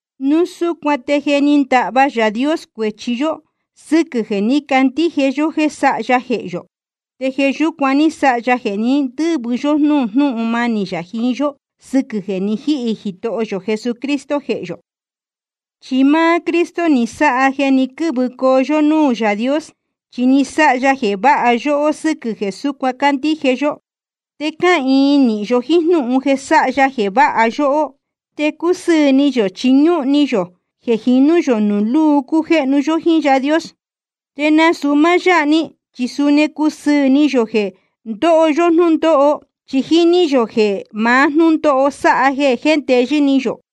Núu súcuan te je ni ndahva Yaā Dios cuēchi yó sɨ́quɨ̄ jeē ní candíje yó jéē sáha ya jehē yō. Te jeē yúcuan ní sáha ya jeē ní ndɨ̄vɨ yó núū jnúhun manī yā jiín yó, sɨquɨ̄ jeē ni jíhī Jitoho yō Jesucristo jehē yō. Chi máá Cristo ni sáha jeē ni quɨ́vɨcoo yó núū Yaā Dios, chi ni sáha ya jeē váha yóhó sɨ́quɨ̄ jeē súcuan cándíje yó. Te cáhīin nīhin yó jíín jnúhun jeē sáha ya jeē váha yóhó. Te cúsɨɨ̄ ni yō chi ñúhun ni yō jeē jinú yō nuū lúu cujéhnu yó jíín Yaā Dios. Te nasūu máá yáha‑ni, chi suni cúsɨɨ̄ ni yō jeē ndóho yó jnúndóho. Chi jíní yō jeē maá jnúndóho sáha jeē jéndeyɨ́ ni yō.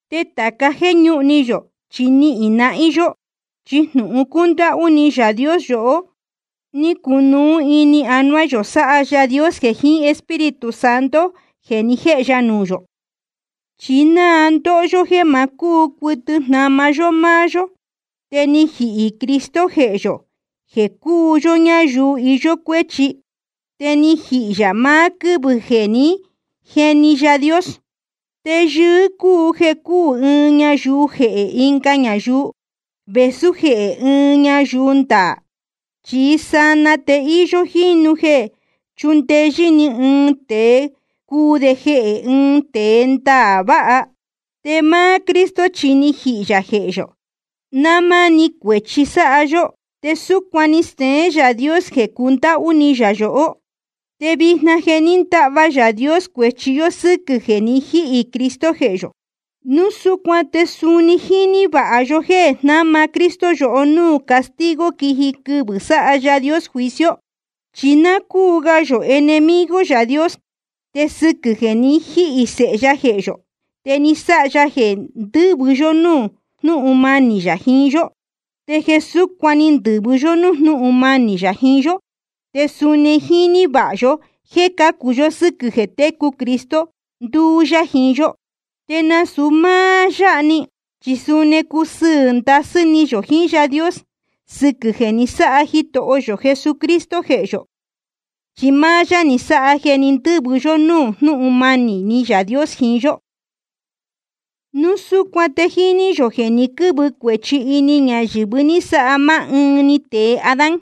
Te tāca jéē ñúhun ni yō, chi nihīn nahín yó. Chi jnūhun cúndáhú ni Yaā Dios yohó, ni cunuú ini anuá yō, sáha Yaā Dios jeē jiín Espíritu Santo jeē ni jéhe ya nuū yō. Chi náa ndóho yó jéē ma cúu cuɨtɨ jnama yó máá yó, te ni jihī Cristo jehē yohó jéē cúu yó ñáyuu íyó cuéchi. Te ni jihī yā maá quɨ́vɨ̄ jeē jé ni jeni Yaā Dios. Te yɨɨ́ cúu jeē cúū ɨɨn ñayuu jehē ɨnga ñayuu, vēsú jehē ɨɨn ñayuu ndaā. Chí sanaa te íyó jínu jeē chúndeyɨ́ ni ɨɨn tēe cuu de jehē ɨɨn tēe ndaā vāha. Te máá Cristo chi ni jihī yā jehē yō náa máni cuēchi sáha yó, te súcuan ni steén Yaā Dios jeē cundáhú ni yā yohó. Te vijna je ni ndahva Yaā Dios cuēchi yó sɨ́quɨ̄ jeē ni jíhī Cristo jehē yō. Núu súcuan te suni jíní vāha yó jéē jnama Cristo yohó núū castigo quiji quɨvɨ̄ sáha Yaā Dios juicio. Chi náa cúu ga yō enemigo Yaā Dios, te sɨquɨ̄ jeē ni jíhī Sēhe ya jehē yō, te ni sáha ya jeē ndɨ́vɨ yó núū jnúhun manī yā jiín yó. Te jeē súcuan ní ndɨ̄vɨ yó nuū jnúhun manī yā jiín yó, te suni jíní vāha yó jéē cācu yó sɨ́quɨ̄ jeē técu Cristo, nduú yá jiín yó. Te nasūu máá yáha‑ni, chi suni cúsɨɨ̄ ndasɨ́ ni yō jiín Yaā Dios sɨquɨ̄ jeē ni sáha Jitoho yō Jesucristo jehē yō, chi máá yá ni sáha jeē ní ndɨ̄vɨ yó núū jnúhun manī Yaā Dios jiín yó. Núu súcuan te jíní yō jeē ni quɨ́vɨ cuēchi ini ñayɨ̄vɨ ní sáha máá ɨɨn‑ni tēe Adán.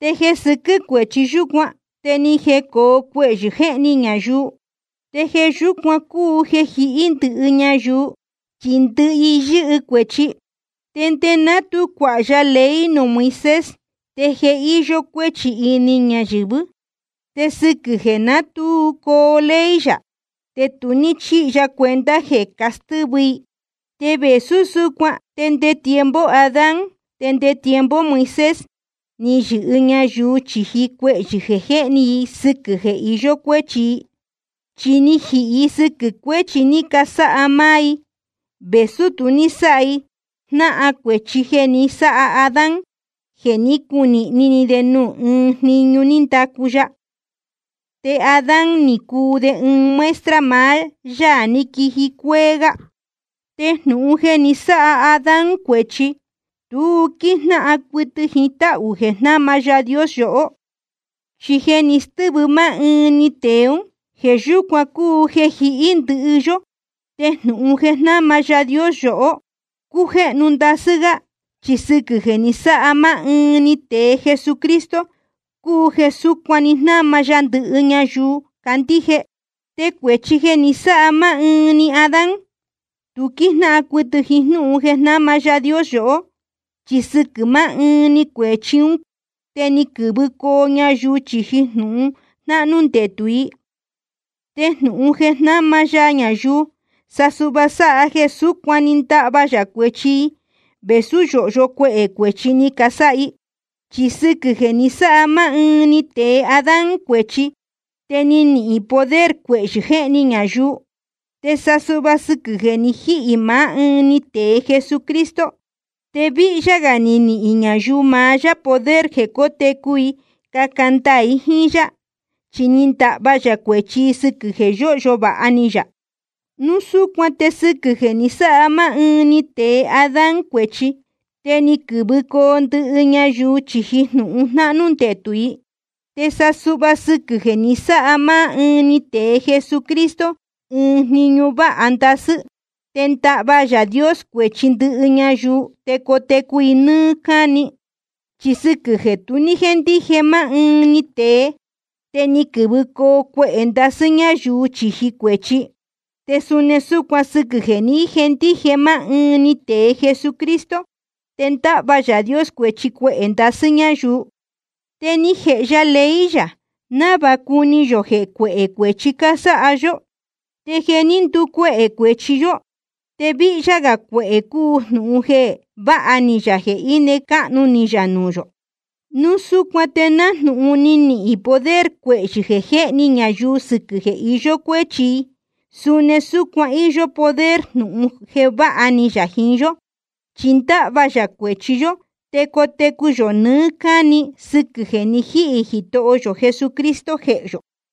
Te jeē sɨquɨ́ cuéchi yúcuan te ni jecōo cuehyɨ̄ jéhni ñayuu. Te jeē yúcuan cúu jeē jihí ndɨhɨ ñayuu, chi ndɨhɨ i yɨ́hɨ cuēchi. Te nde ná tu cuāha ya ley nuū Moisés, te je íyó cuéchi ini ñayɨ̄vɨ́. Te sɨquɨ̄ jeē ná tu coo ley yā, te tu ní chíhi ya cuenta jeē castɨ́vɨ i. Te vēsú súcuan te nde tiempo Adán te nde tiempo Moisés ni yɨhɨ ñayuu chīji cuehyɨ̄ jeē jéhni i sɨquɨ̄ jeē iyó cuéchi i. Chi ni jihī i sɨquɨ̄ cuēchi ni casáha máá i, vēsú tu ní sáha i jnáhan cuēchi jeē ni sáha Adán jeē ní cunīhni ni de nuū ɨɨn jniñu ní ndacu ya. Te Adán ni cuu de ɨɨn muestra maá Yaā ní quiji cuéé gá. Te jnūhun jeē ni sáha Adán cuēchi, tu quíjnáhan cuɨtɨ jiín táhū jeē jnáma Yaā Dios yohó. Chi jeē ni stɨ́vɨ máá ɨɨn‑ni tēe ún, jeē yúcuan cúu jeē jihí ndɨhɨ yó. Te jnūhun jeē jnáma Yaā Dios yohó cújéhnu ndasɨ́ gá, chi sɨquɨ̄ jeē ni sáha máá ɨɨn‑ni tēe Jesucristo cúu jeē súcuan‑ni jnáma ya ndɨhɨ ñayuu candíje. Te cuēchi jeē ni sáha máá ɨɨn‑ni Adán, tu quíjnáhan cuɨtɨ jíín jnúhun jeē jnáma Yaā Dios yohó. Chi sɨquɨ̄ máá ɨɨn‑ni cuēchi ún te ni quɨ̄vɨcoo ñayuu chīji jnūhun jnahnū ndetū i. Te jnūhun jeē jnáma ya ñayuu, sa suhva sáha jeē súcuan‑ni ndáhva yā cuēchi i, vēsú yōhyo cuehē cuēchi ni casáha i. Chi sɨquɨ̄ jeē ni sáha máá ɨɨn‑ni tēe Adán cuēchi, te ni nihīn poder cuehyɨ jéhni ñayuu. Te sa suhva sɨquɨ̄ jeē ni jíhī maá ɨɨn‑ni tēe Jesucristo, te víhyá gā ni nihīn ñayuu maá yá poder jeē cótecu i caca ndaā i jíín yá. Chi ni ndahva yā cuēchi i sɨquɨ̄ jeē yóhyo vāha ni yā. Núu súcuan te sɨquɨ̄ jeē ni sáha máá ɨɨn‑ni tēe Adán cuēchi, te ni quɨ̄vɨcoo ndɨhɨ ñayuu chīji jnūhun jnahnū ndetū i. Te sa suhva sɨquɨ̄ jeē ni sáha máá ɨɨn‑ni tēe Jesucristo ɨɨn jniñu váha ndasɨ́, te ndáhva Yaā Dios cuēchi ndɨhɨ ñayuu te cotecu i nɨ́ɨ́ cáni. Chi sɨquɨ̄ jeē tu ní jéndije máá ɨɨn‑ni tēe, te ni quɨ̄vɨcoo cuehē ndasɨ́ ñáyuu chīji cuēchi. Te suni súcuan sɨquɨ̄ jeē ní jendije máá ɨɨn‑ni tēe Jesucristo, te ndáhva Yaā Dios cuēchi cuehē ndasɨ́ ñáyuu. Te ni jēhe ya ley yā návāha cuni yō jeē cuéhē cuēchi cásáha yó. Te jeē ní nducuehē cuēchi yó, te víhyá gā cuehē cúu jnūhun jeē váha ni yā jeē íne cáhnu ni yā nuū yō. Núu súcuan te nájnūhun ni nihīn poder cuehyɨ̄ jéhni ñayuu sɨquɨ̄ jeē iyó cuéchi i, suni súcuan íyó poder jnūhun jeē váha ni yā jiín yó. Chi ndáhva yā cuēchi yó te cotecu yō nɨɨ́ cáni sɨquɨ̄ jeē ni jíhī Jitoho yō Jesucristo jehē yō.